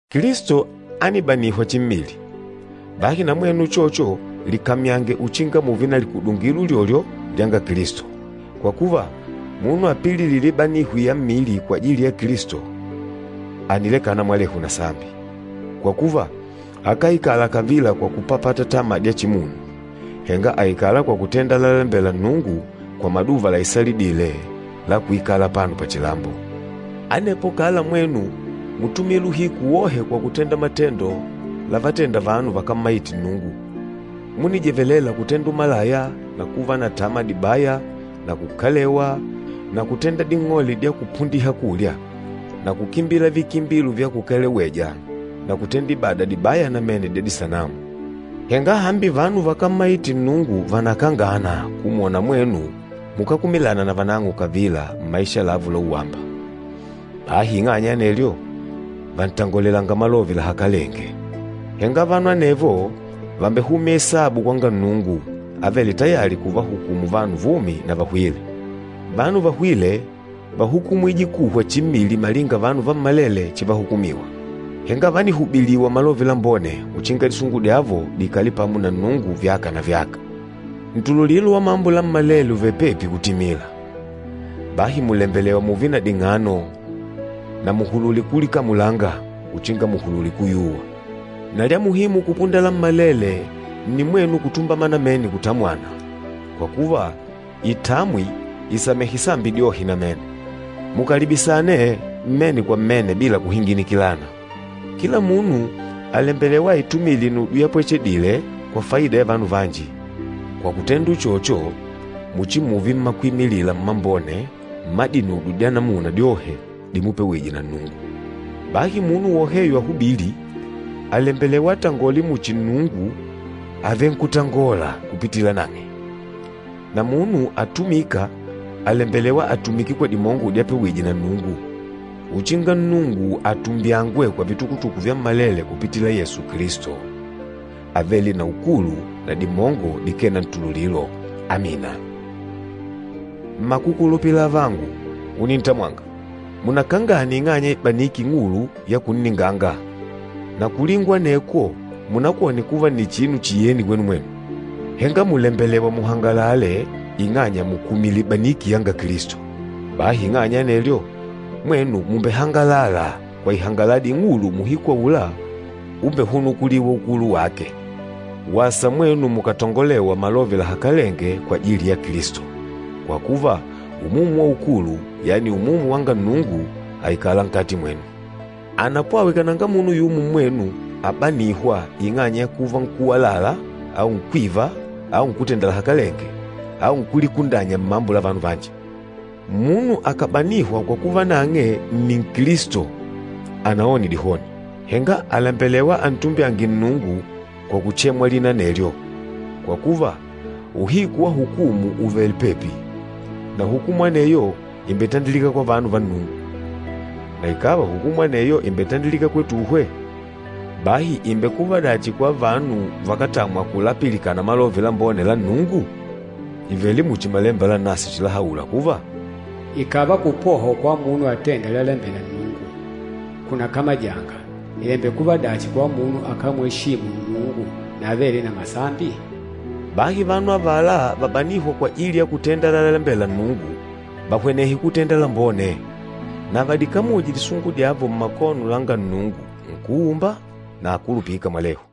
Kilisto ánibanihwa chimmili. Bahi na mwenu uchocho likamyange uchinga mùùve na likudungilo ulyolyo lyanga Kilisto. Kwa kuva, munu apililîla ibanihwi ya mmili kwajili ya Kilisto, ànilekana mwalehu na sambi. Kwa kuva, akáikala kavila kwa kupapata tama dya chimunu, henga àikala kwa kutenda lalalembela Nnungu kwa maduva laisalidîle la kuikala apano pachilambo. Anepo kala mwenu mútumila uhiku wohe kwa kutenda matendo lavatenda vanu vakámmaite Nnungu. Múnijevelela kutenda umalaya na kuva na tama dibaya na kukalewa na kutenda ding'ole dya kupundiha kulya, na kukimbila vikimbilo vya kukaleweja na kutenda ibada dibaya namene dya disanamu. Henga hambi vanu vakámmaite Nnungu vànakangana kumwona mwenu mukákumilana na vanang'o kavila mmaisha lavo la uwamba, bahi ing'anya ya anelyo, vàntangolelanga malove lahakalenge. Henga vanu anevo vàmbehumya isabu kwanga Nnungu, avêle tayali kuvahukumu vanu vumi na vahwîle. Vanu vahwîle, váhukumwije kuhwa chimmili malinga vanu vammalele chivahukumiwa, henga vánihubiliwa Malove Lambone uchinga disungu dyavo diikale pamo na Nnungu vyaka na vyaka. Ntululilo wa mambo lammalele ùvele pepi kutimila. Bahi mùlembelewa mùùve na ding'ano na muhulule kulikamulanga uchinga muhulule kuyuwa. Na lya muhimu kupunda lammalele nni mwenu kutumbama namene kutamwana, kwa kuva itamwi ìsamehe sambi dyohe namene. Mukalibisane mmene kwa mmene bila kuhinginikilana. Kila munu àlembelewa aitumile inudyo yapwechedile, kwa faida ya vanu vanji, kwa kutenda uchocho muchimuve mmakwimilila mmambone mma dinudyo dya namuna dyohe dimupewije na Nnungu. Bahi munu woheyo ahubîli, àlembelewa atangole muchi Nnungu àvenkutangola kupitila nang'e. Na munu atumîka, àlembelewa atumike kwa dimongo dyapewije na Nnungu, uchinga Nnungu atumbyangwe kwa vitukutuku vyammalele kupitila Yesu Kilisto, avêle na ukulu na dimongo dikee na ntululilo. Amina. Mmakukulupila avangu unintamwanga, munakangane ing'anya ya ibaniki ing'ulu ya kunninganga. Na kulingwa anekwo munakwone kuva nni chinu chiyeni kwenu mwenu. Henga mùlembelewa muhangalale ing'anya mùkumila ibaniki yanga Kilisto. Bahi ing'anya ya anelyo, mwenu mùmbehangala kwa ihangaladi ing'ulu muuhiku aula umbehunukulîwa ukulu wake. Wasa mwenu mukàtangolewa malove lahakalenge kwajili ya Kilisto, kwa kuva Umumu wa ukulu, yani Umumu wanga Nnungu àikala nkati mwenu. Anapwawe kananga munu yumo mmwenu abanîhwa ing'anya ya kuva nkúwalala au nkwíva au nkútenda lahakalenge au nkúlikundanya mmambo la vanu vanji. Munu akàbanihwa kwa kuva nang'e nni Nkilisto anaone dihoni, henga àlembelewa antumbyange Nnungu kwa kuchemwa lina anelyo. Kwa kuva, uhiku wa hukumu ùvele pepi. Na hukumu aneyo ìmbetandilika kwa vanu va Nnungu. Na ikàva hukumu aneyo ìmbetandilika kwetuhwe, bahi ìmbekuva dachi kwa vanu vakátamwa kulapilikana Malove Lambone la Nnungu? Ìvele muchi Malemba Lanaswe chilahaula kuva, “Ikàva kupohwa kwa munu atênda lalalembela Nnungu kunakamajanga, ìmbekuva dachi kwa munu akámweshimu Nnungu na avêle na masambi?” Bahi vanu avala vabanîhwa kwajili ya kutenda lalalembela Nnungu, vahwenehe kutenda lambone, na vadikamuje disungu dyavo mmakono langa Nnungu, Nkúumba, na akulupîka mwalehu.